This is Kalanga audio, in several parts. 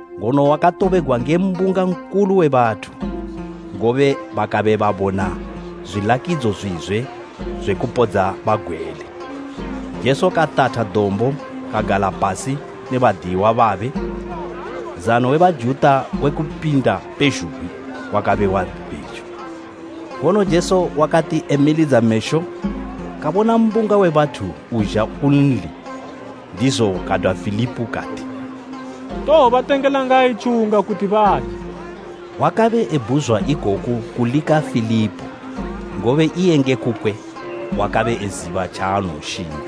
Ngono wakatobegwa nge mbunga nkulu we bathu, ngobe bakabe babona zwilakidzo zwizwe zwe kupodza bagwele. Jesu katatha dombo kagala pasi ne badiyiwa babe. Nzano we Bajuta we Kupinda pezhugwi wakabe wabe pejo. Ngono Jesu wakati emilidza mesho kabona mbunga we bathu uzha kunli, ndizo kadwa Filipo kati, “Towobatengela ngayi tjiwunga kuti baje?” Wakabe ebhuzwa ikoku kulika Filipo, ngobe iye nge kukwe wakabe eziba tjaanowoshinga.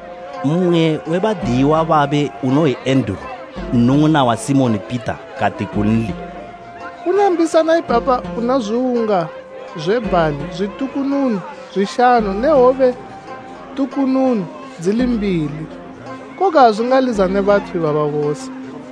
Mmwe we badiyiwa babe unoyi Enduru, nnung'una wa Simoni Pita kati kunli, “Kuna mbisana ipapa una zwiwunga zwe bhali zwitukununu zwishanu ne hwobe tukununu dzili mbili; koga azwingalizane bathu ibaba bose.”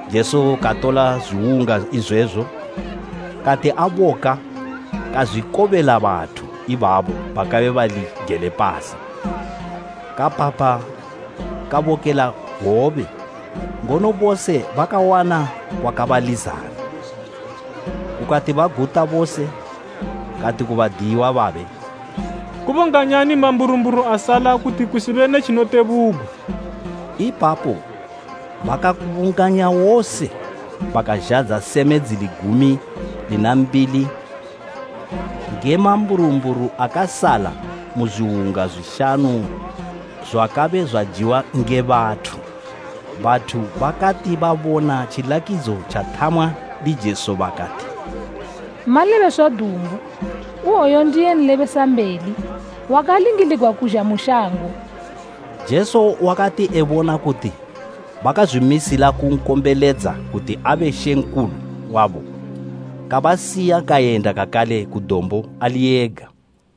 Jesu katola zwiwunga izwezo, kati aboka kazwikobela bathu ibabo bakabe bali gele pasi. Kapapha kabokela hwobe, ngono bose bakawana kwakabalizana. Kukati baguta bose, kati ku badiyiwa babe, “Kubunganyani mamburumburu asala, kuti kusibe ne tjinotebugwa.” Ipapo bakaakubunganya wose bakazhadza seme dzili gumi lina mbili nge mamburumburu akasala mu zwiwunga zwishanu zwakabe zwajiwa nge bathu. Bathu bakati babona tjilakidzo tjathamwa ndi Jesu bakati, “Malebeswa dumbu, oyu ndiye nlebesambeli wakalingiligwa kuzha mu shango.” Jesu wakati ebona kuti bakazwimisila kunkombeledza kuti abe mambo wabo, kabasiya kayenda kakale ku dombo ali yega.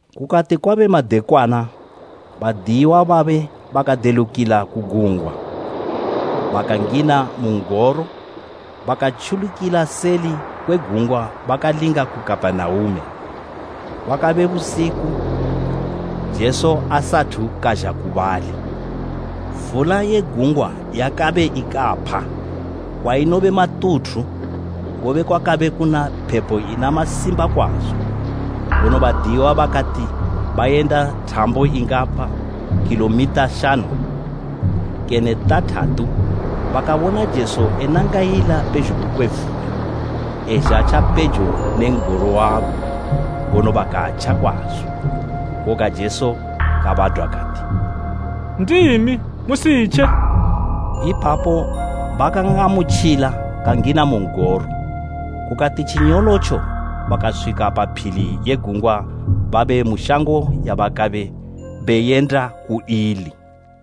Kukati kwabe madekwana, badiyiwa babe bakadelukila ku gungwa, bakangina mu n'goro, bakatjulukila seli kwe gungwa bakalinga ku Kapenaume. Kwakabe busiku Jesu asathu kazha ku bali. Vula ye gungwa yakabe ikapha kwainobe matuthu, ngobe kwakabe kuna phepo ina masimba kwazo. Ngono Badiyiwa bakati bayenda thambo ingapa khilomitha shanu kene tathatu bakabona Jesu enangayila pezhugwi kwe vula, ezha tjapejo ne n'goro wabo, ngono bakatja kwazo. Koga Jesu kabadwa kati, “Ndimi, musitje!” Ipapo bakan'amutjila kangina mu n'goro, kukati tjinyolotjo bakaswika pa phili ye gungwa babe mu shango yabakabe beyenda ku ili.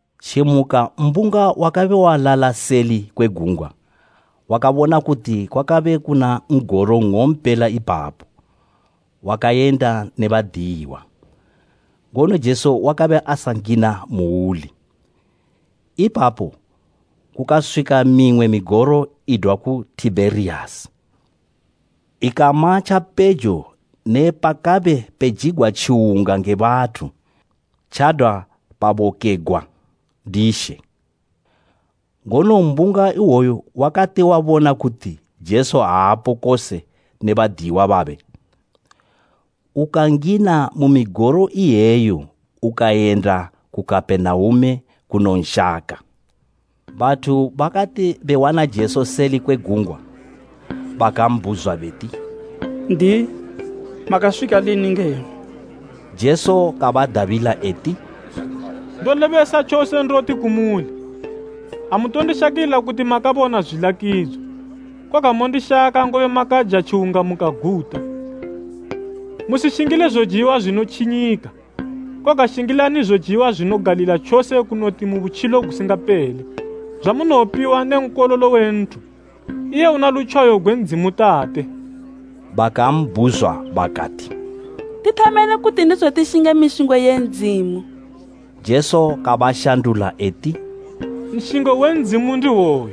Tjimuka mbunga wakabe walala seli kwe gungwa wakabona kuti kwakabe kuna n'goro nng'ompela ipapo wakayenda ne badiyiwa, ngono Jesu wakabe asangina muuli. Ipapo kukaswika mimwe migoro idwa ku Tibheriyasi, ikama tjapejo ne pakabe pejigwa tjiwunga nge bathu, tjadwa pabokegwa ndi She. Ngono mbunga iwoyo wakati wabona kuti Jesu aapo kose ne badiyiwa babe, ukangina mu migoro iyeyo ukayenda ku Kapenaume kunonshaka. Bathu bakati bewana Jesu seli kwe gungwa, bakambhuzwa beti, “N'diyi, makaswika lini ngeno?” Jesu kabadabila eti, “Ndolebesa tjose ndoti kumuli, amutondishakila kuti makabona zwilakidzo, koga mondishaka, ngobe makaja tjiwunga mukaguta. Musishingile zojiwa zwinotjinyika, koga shingilani zojiwa zwinogalila tjose kunoti mu butjilo gusingapele, zwamunowopiwa ne Nkololo we nthu, iye una lutjwayo gwe Ndzimu Tate.” Bakambhuzwa bakati, “Tithameni kuti ndizo tishinge mishingo ye Ndzimu?” Jesu kabashandula eti, “Nshingo we Ndzimu ndihwoyu;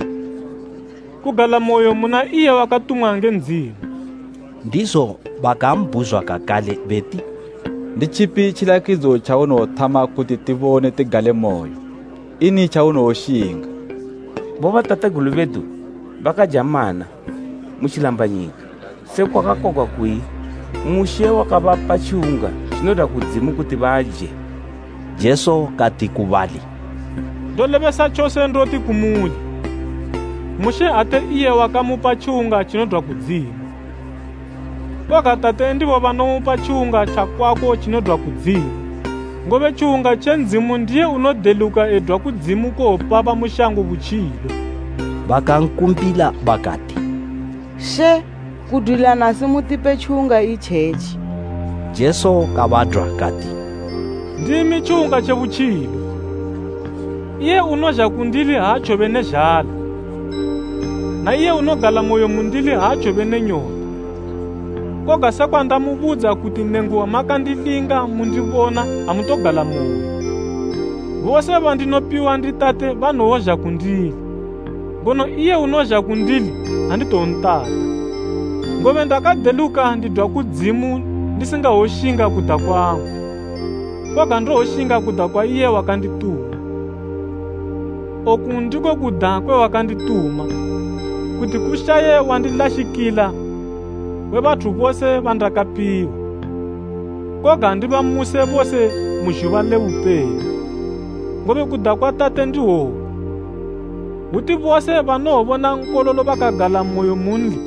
kugalamoyo muna iye wakatumwa nge Ndzimu.” Ndizo bakambhuzwa kakale beti, “Nditjipi tjilakidzo tjaunowothama, kuti tibone tikugalemoyo? Ini tjaunowoshinga? Bobatategulu bedu bakaja mana mu tjilambanyika, sekwa kwakakwagwa kuyi ‘Mushe wakabapa tjiwunga tjinodwa kudzimu kuti baje.’” Jesu kati ku bali, “Ndolebesa tjose ndoti kumuli, Mushe ate iye wakamupa tjiwunga tjinodwa kudzimu, koga Tate ndibo banomupa tjiwunga tjakwako tjinodwa kudzimu. Ngobe tjiwunga tje Ndzimu ndiye unodeluka edwa kudzimu kuwopa bamu shango butjilo.” Bakankumbila bakati, “She, kudwila nasi mutipe tjiwunga itjetji.” Jesu kabadwa kati, “Ndimi tjiwunga tje butjilo, iye unozha kundili aatjowobe ne zhala, na iye unogalamoyo mundili aatjowobe ne nyota. Koga sekwa ndamubudza kuti nenguba makandilinga mundibona, amutogalamoyo. Bose bandinopiwa ndi Tate banowozha kundili, ngono iye unozha kundili anditowontata, Ngobe ndakadeluka ndidwa kudzimu ndisingawoshinga kuda kwangu, koga ndowoshinga kuda kwa iye wakandituma. Oku ndiko kuda kwe wakandituma, kuti kushaye wandilashikila we bathu bose bandakapiwa, koga ndibamuse bose mu zhuba le bupelo. Ngobe kuda kwa Tate ndihwoku, hwuti bose banowobona Nkololo bakagalamoyo munli,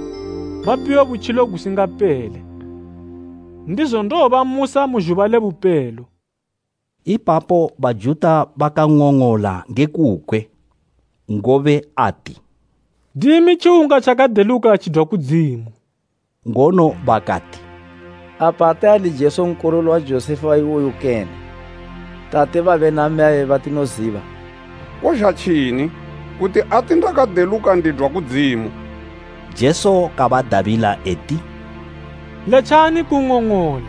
bapiwe butjilo gusingapele. Ndizo ndowobamusa mu zhuba le bupelo.” Ipapo Bajuta bakang'ong'ola nge kukwe, ngobe ati, “Ndimi tjiwunga tjakadeluka tjidwa kudzimu.” Ngono bakati, “Apa ate ali Jesu nkololo wa Josefa iwoyu kene, tate babe na mmeyabe batinoziba? Kozha tjini kuti ati ‘Ndakadeluka ndidwa kudzimu?’” Jesu kabadabila eti, “Letjani kung'ong'ola.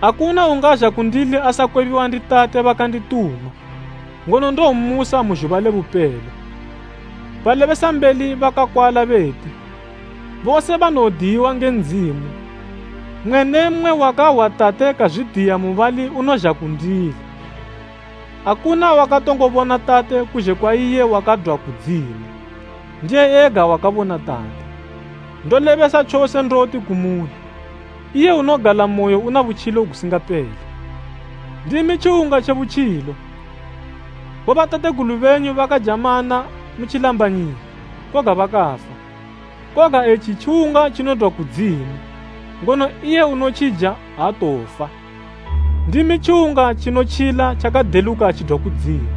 Akuna ungazha kundili asakwebiwa ndi Tate bakandituma, ngono ndowommusa mu zhuba le bupelo. Balebesambeli bakakwala beti, ‘Bose banowodiyiwa nge Ndzimu.’ Mmwe ne mmwe wakahwa Tate kazwidiya mubali unozha kundili. Akuna wakatongo bona Tate kuzhe kwa iye wakadwa ku Ndzimu, ndiye ega wakabona Tate. Ndolebesa tjose ndoti kumuli, iye unogalamoyo una butjilo gusingapele. Ndimi tjiwunga tje butjilo. Bobatategulu benyu bakaja mana mu tjilambanyika, koga bakafa. Koga etji tjiwunga tjinodwa kudzimu, ngono iye unotjija aatowofa. Ndimi tjiwunga tjinotjila tjakadeluka tjidwa kudzimu.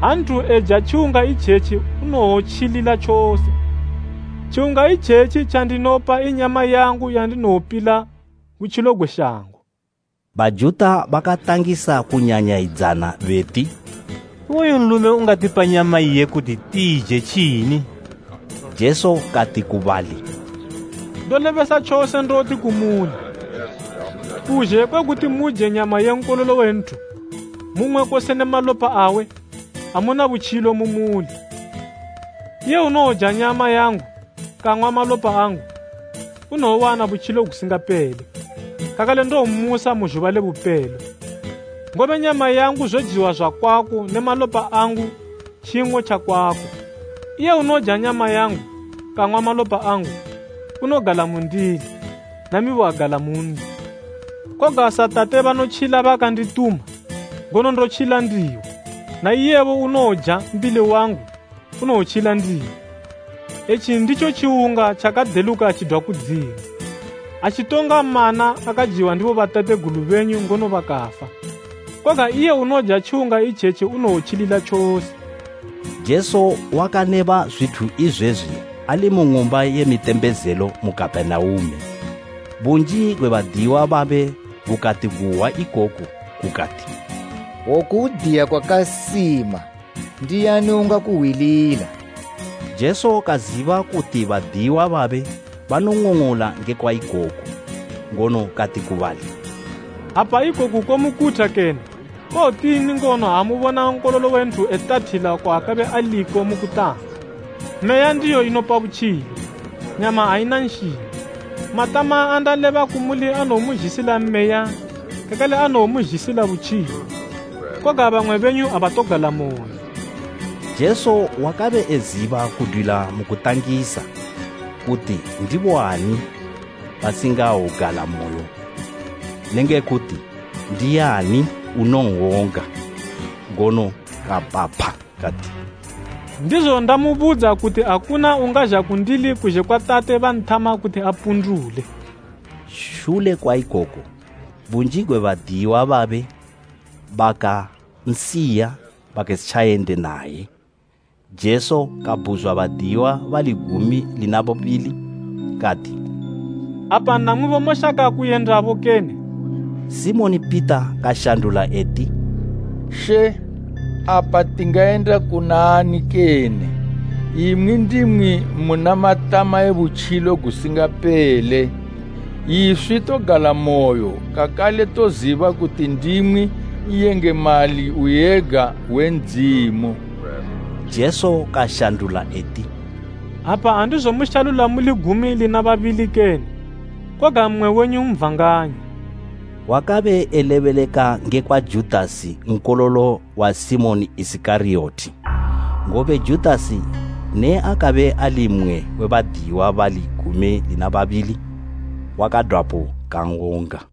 Ha nthu eja tjiwunga itjetji unowotjilila tjose. Tjiwunga itjetji tjandinopa i nyama yangu yandinowopila butjilo gwe shango.” Bajuta bakatangisa kunyanyayidzana beti, “Iwoyu nlume ungatipa nyama iye kuti tiije tjini?” Jesu kati ku bali, “Ndolebesa tjose ndoti kumuli, kuzhe kwe kuti muje nyama ye Nkololo we nthu, mung'we kose ne malopa awe, amuna butjilo mu muli. Iye unowoja nyama yangu, kang'wa malopa angu, unowowana butjilo gusingapele, kakale ndowommusa mu zhuba le bupelo. Ngobe nyama yangu zojiwa zwakwako ne malopa angu tjing'o tjakwako. Iye unoja nyama yangu, kang'wa malopa angu, unogala mundili, namibo agala munli. Koga sa Tate banotjila bakandituma, ngono ndotjila ndibo, na iyebo unowoja mbili wangu unowotjila ndimi. Etji nditjo tjiwunga tjakadeluka tjidwa kudzimu, atjitonga mana akajiwa ndi bobatategulu benyu ngono bakafa. Koga iye unoja tjiwunga itjetji unowotjilila tjose.” Jesu wakaleba zwithu izwezwi ali mu ng'umba ye mitembezelo mu Kapenaume. Bunji gwe badiyiwa babe gukati guhwa ikoku gukati, “Oku hwudiya kwakasima. Ndiani ungakuhwilila?” Jesu kaziba kuti badiyiwa babe banong'ong'ola ngekwa ikoku, ngono kati ku bali, “Apa ikoku komukutha kene? Kowotini ngono ha mubona Nkololo we nthu etathila kwaakabe aliko mu kutanga? Meya ndiyo inopa butjilo, nyama aina nshingo. Matama andaleba kumuli anowomuzhisila Meya kakale anowomuzhisila butjilo. Koga bamwe benyu abatogalamoyo.” Jesu wakabe eziba kudwila mu kutangisa, kuti ndiboani basingawogalamoyo ne nge kuti ndiani unowon'wonga. Ngono kapapha kati, “Ndizo ndamubudza kuti akuna ungazha kundili kuzhe kwa Tate banthama kuti apundule.” Shule kwa ikoku, bunji gwe badiyiwa babe bakansiya bakasitjayende naye. Jesu kabhuzwa badiyiwa bali gumi lina babili kati, “Apa namwibo moshaka kuyendabo kene?” Simoni Pita kanshandula eti, “She, apa tingayenda kuna ani kene? Imwi ndimwi muna matama e butjilo gusingapele. Iswi togalamoyo kakale toziba kuti ndimwi N'yengemali Uyega we Ndzimu.” Jesu kashandula eti, “Apa andizomushalula muli gumi lina babili kene? Koga mmwe wenyu ndi Satani!” Wakabe elebeleka ngekwa Judasi, nkololo wa Simoni Isikariyoti, ngobe Judasi ne akabe ali mmwe we badiyiwa bali gumi lina babili, wakadwapo kan'wonga.